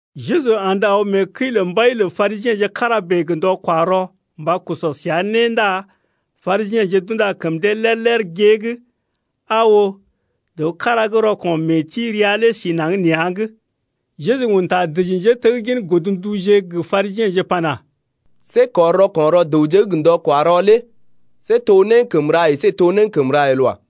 Jeju andə aw mee kəi lə mbai lə Parisiḛje kára bèe gə ndɔ-kwa-rɔ mba sɔ səa né ndá Parisiḛje d’unda kəm dee lér-lér gée’g. Aa oo, dəw kára gə́ rɔko̰ mee-ti rəa lé si naŋg nea̰’g. Jeju un ta dəji njéteggin godnduje gə Parisiḛje pana: See kɔr rɔko̰ rɔ dəwje’g gə ndɔ-kwa-rɔ lé see to né gə́ kəm ra əsé to né gə́ kəm ra el wa.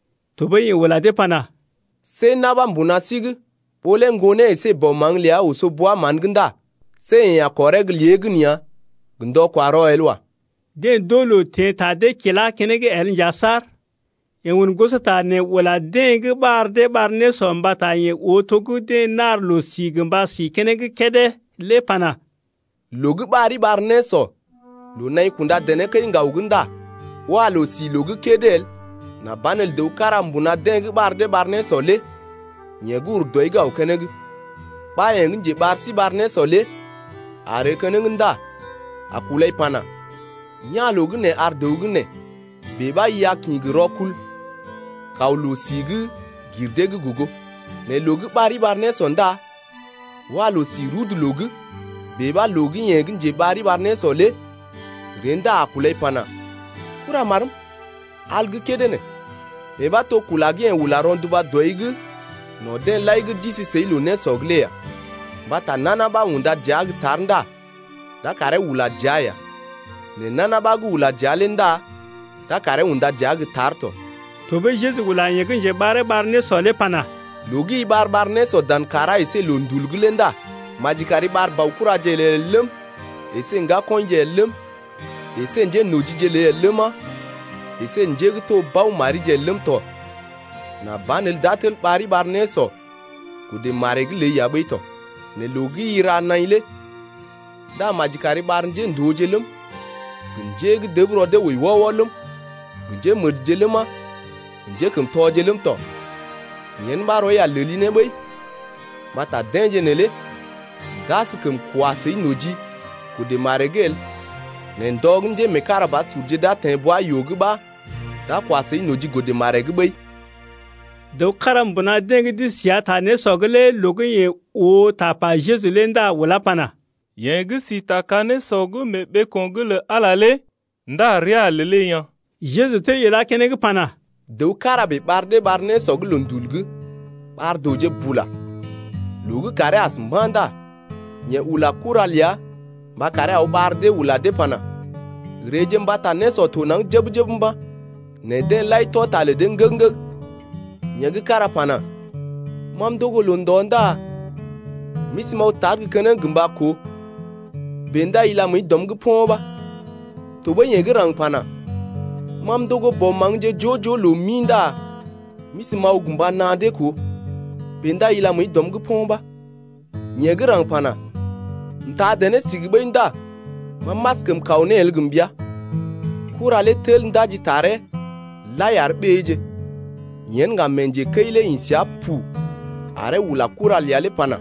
Tɔɓəi yeḛ ula dee pana: See na̰ ɓa mbuna sí’g, ɓó lé ŋgonee əsé bɔ maŋg ləa oso bwa-mán’g ndá see yeḛ a kɔree gə́ lé gən ya gə ndɔ-kwa-rɔ el wa. Deḛ d’oo loo teḛ ta dee kila keneŋ el nja saar. Yeḛ un gosota nee ula deḛ gə́ ɓar dee ɓar nésɔ mbata yeḛ oo to gə́ deḛ nar loo-si gə mba sí keneŋ kédé lé pana: Loo gə́ ɓari ɓar nésɔ loo naḭ kunda dené kəi-ŋgaw’g ndá wa loo-si loo gə́ kédé el nà banelə dəw kára mbuna deḛ gə́ ɓar dee ɓar nésɔ lé yeḛ gə́ ur dɔi’g aw keneŋ, ɓa yeḛ gə́ njeɓar sí ɓar nésɔ lé a ree keneŋ ndá a kulai pana: Ya̰ loo gə́ nee ar dəw gə́ nee. Bèe ɓa i a kḭ gə rɔkul kaw loo-si gə́ gir dee’g gogo. Nɛ loo gə́ ɓari ɓar nésɔ ndá wa loo-si rudu loo’g. Bèe ɓa loo gə́ yeḛ gə́ njeɓari ɓar nésɔ lé ree ndá a kulai pana: Kuramarm, al gə́ kédé nee. Yee ɓa to kula gə́ yeḛ ula rɔnduba dɔi’g no̰ deḛ lai gə́ d’isi səi loo-nésɔ’g lé ya. Mbata nana ɓa gə́ unda dəa gə́ tar ndá d’a karee ula dəa ya, nɛ nana ɓa gə́ ula dəa lé ndá d’a karee unda dəa gə́ tar tɔ. Tɔɓəi Jeju ula yeḛ gə́ njeɓaree ɓar nésɔ lé pana: Loo gə́ i ɓar-ɓar nésɔ dan kàrá əsé gə loondul’g lé ndá maji kari ɓar baokuraje ləi el ləm, əsé ŋgakɔḭje el ləm, əsé njénojije ləi el ləma, əsé njé gə́ to bao marije el ləm tɔ, nà banelə d’a tel ɓari ɓar nésɔ godə maree’g ləi ya ɓəi tɔ. Nɛ loo gə́ i ra naḭ lé ndá maji kari ɓar njéndooje ləm, gə njé gə́ dəb rɔ dee wəi wɔ-wɔ ləm, gə njémədje ləma, gə njékəmtɔje ləm tɔ. Yen ɓa rɔi a leli ne ɓəi mbata deḛje neelé d’askəm kwa səi noji godə maree’g el, nɛ ndɔ gə́ njémeekarabasurje d’a teḛ bwa-yoo’g ɓa d’a kwa səi noji godə maree’g ɓəi. Dəw kára mbuna deḛ gə́ d’isi səa ta nésɔ’g lé loo gə́ yeḛ oo tapa Jeju lé ndá ulá pana: Yeḛ gə́ si ta ka-nésɔ mee ɓeeko̰’g lə Ala lé ndá rəa a lelee yaa̰. Jeju tel ilá keneŋ pana: Dəw kára bèe ɓar dee ɓar nésɔ gə́ loondul’g, ɓar dəwje bula. Loo gə́ kàree as mba̰ ndá yeḛ ula kura ləa mba karee aw ɓar dee ula dee pana: Reeje mbata nésɔ to naŋg jəb-jəb mba̰, Nɛ deḛ lai tɔ ta lə dee nəg-nəg. Yeḛ gə́ kára pana: Ma m’ndogo loo-ndɔ ndá m’isi m’aw tar gə́ keneŋ gə mba koo, bèe ndá ila məəi dɔm’g po̰ ɓa. Tɔɓəi yeḛ gə́ raŋg pana: Ma m’ndogo bɔ maŋgje joo-joo loo mi ndá m’isi m’aw gə mba naa dee koo, bèe ndá ila məəi dɔm’g po̰ ɓa. Yeḛ gə́ raŋg pana: M’taa dené sigi ɓəi ndá ma m’askəm kaw ne el gə mbəa. Kura lé tel ndaji taree lai ar ɓéeje. Yen ŋga mee njekəi lé ḭ səa pu aree ula kura ləa lé pana: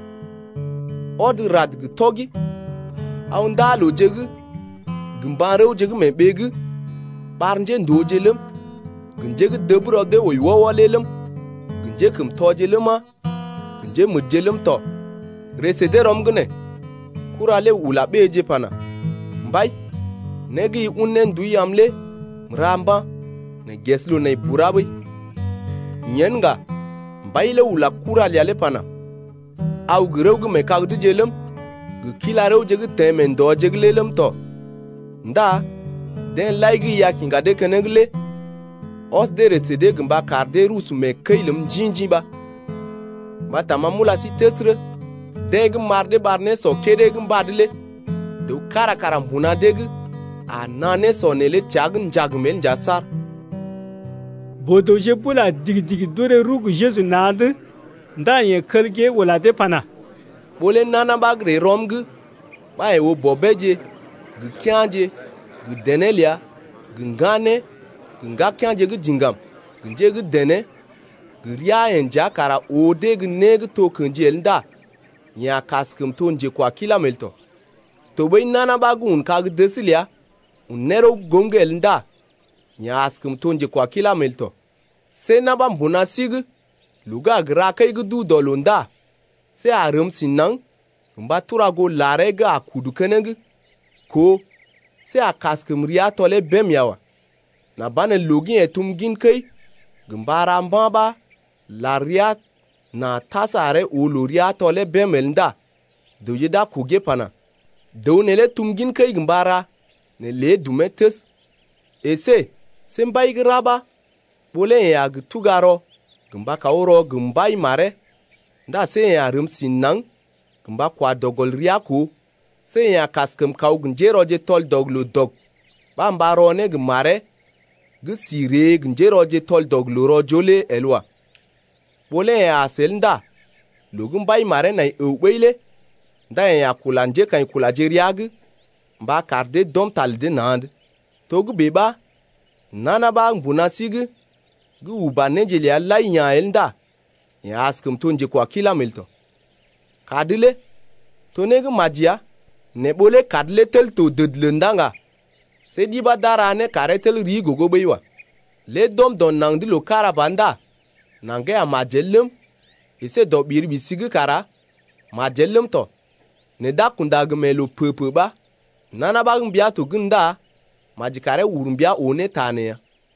Ɔd rad gə tɔgi aw ndaa-looje’g gə mba̰-rəwje gə́ mee ɓee’g, ɓar njéndooje ləm, gə njé gə́ dəb rɔ dee wəi wɔ-wɔ lé ləm, gə njékəmtɔje ləma, gə njémədje ləm tɔ, ree sə dee rɔm’g nee. Kura lé ula ɓéeje pana: Mbai, né gə́ i un ne ndui am lé m’ra mba̰, nɛ ges loo nai bura ɓəi. Yen ŋga mbai lé ula kura ləa lé pana: Aw gə rəw gə́ mee kag’dje ləm, gə kila-rəwje gə́ teḛ mee ndɔje’g lé ləm tɔ ndá deḛ lai gə́ i a kiŋga dee keneŋ lé ɔs dee ree sə dee gə mba kar dee rusu mee kəi ləm njḭ-njḭ ɓa. Mbata ma m’ula sí təsərə, deḛ gə́ m’ɓar dee ɓar nésɔ kédé gə́ mbad lé dəw kára kara mbuna dee’g a naa nésɔ neelé təa’g njagm el nja saar. Boo-dəwje bula digi-digi d’orè rəw gə Jeju na̰’d. Ndá yeḛ kel gée ula dee pana: Ɓó lé nana ɓa gə́ ree rɔm’g ɓa yeḛ oo bɔbeeje gə kea̰je gə dené ləa gə ŋganeeje gə ŋgakea̰je gə́ diŋgam gə njé gə́ dené gə rəa-yeḛ nja kara oo dee gə́ né gə́ to kḛji el ndá yeḛ a kaskəm to njekwakilam el tɔ. Tɔɓəi nana ɓa gə́ un kag-dəs ləa un ne rəw goom’g el ndá yeḛ askəm to njekwakilam el tɔ. See na̰ ɓa mbuna sí’g loo gə́ a gə ra kəi gə́ duu dɔ loo ndá see a rəm si naŋg gə mba tura goo laree gə́ a kudu keneŋ koo see a kaskəm rəa tɔlee bém ya wa, nà banelə loo gə́ yeḛ tum gin kəi gə mba ra mba̰ ɓa lar rəa na tas aree oo loo rəa tɔlee bém el ndá dəwje d’a kogee pana: Dəw neelé tum gin kəi gə mba ra, nɛ lé dumee təs. Esé see mbai gə́ ra ɓa ɓó lé yeḛ a gə tuga rɔ gə mba kaw rɔ gə mbai maree ndá see yeḛ a rəm si naŋg gə mba kwa dɔ gɔl rəa koo, see yeḛ a kaskəm kaw gə njérɔje tɔl-dɔg-loo-dɔg ɓa mba rɔ ne gə maree gə́ si ree gə njérɔje gə́ d’as tɔl-dɔg-loo-rɔ-joo lé el wa. Ɓó lé yeḛ as el ndá loo gə́ mbai maree nai əw ɓəi lé ndá yeḛ a kula njékaḭkulaje rəa’g mba kar dee d’ɔm ta lə dee na̰’d. Togə́bè ɓa nana ɓa mbuna sí’g gə́ uba néje ləa lai ya̰ el ndá yeḛ askəm to njekwakilam el tɔ. Kad lé to né gə́ maji ya, nɛ ɓó lé kad lé tel to dədələ ndá ŋga see ɗi ɓa d’a ra ne karee tel rii gogo ɓəi wa. Lée d’ɔm dɔ naŋg’d loo kára ba ndá naŋgee a majel ləm, əsé dɔ ɓiri-ɓisi’g kara majel ləm tɔ, nɛ d’a kunda gə mee loo pə-pə ɓa. Nana ɓa gə́ mbia to gən ndá maji karee ur mbia oo ne ta nee ya.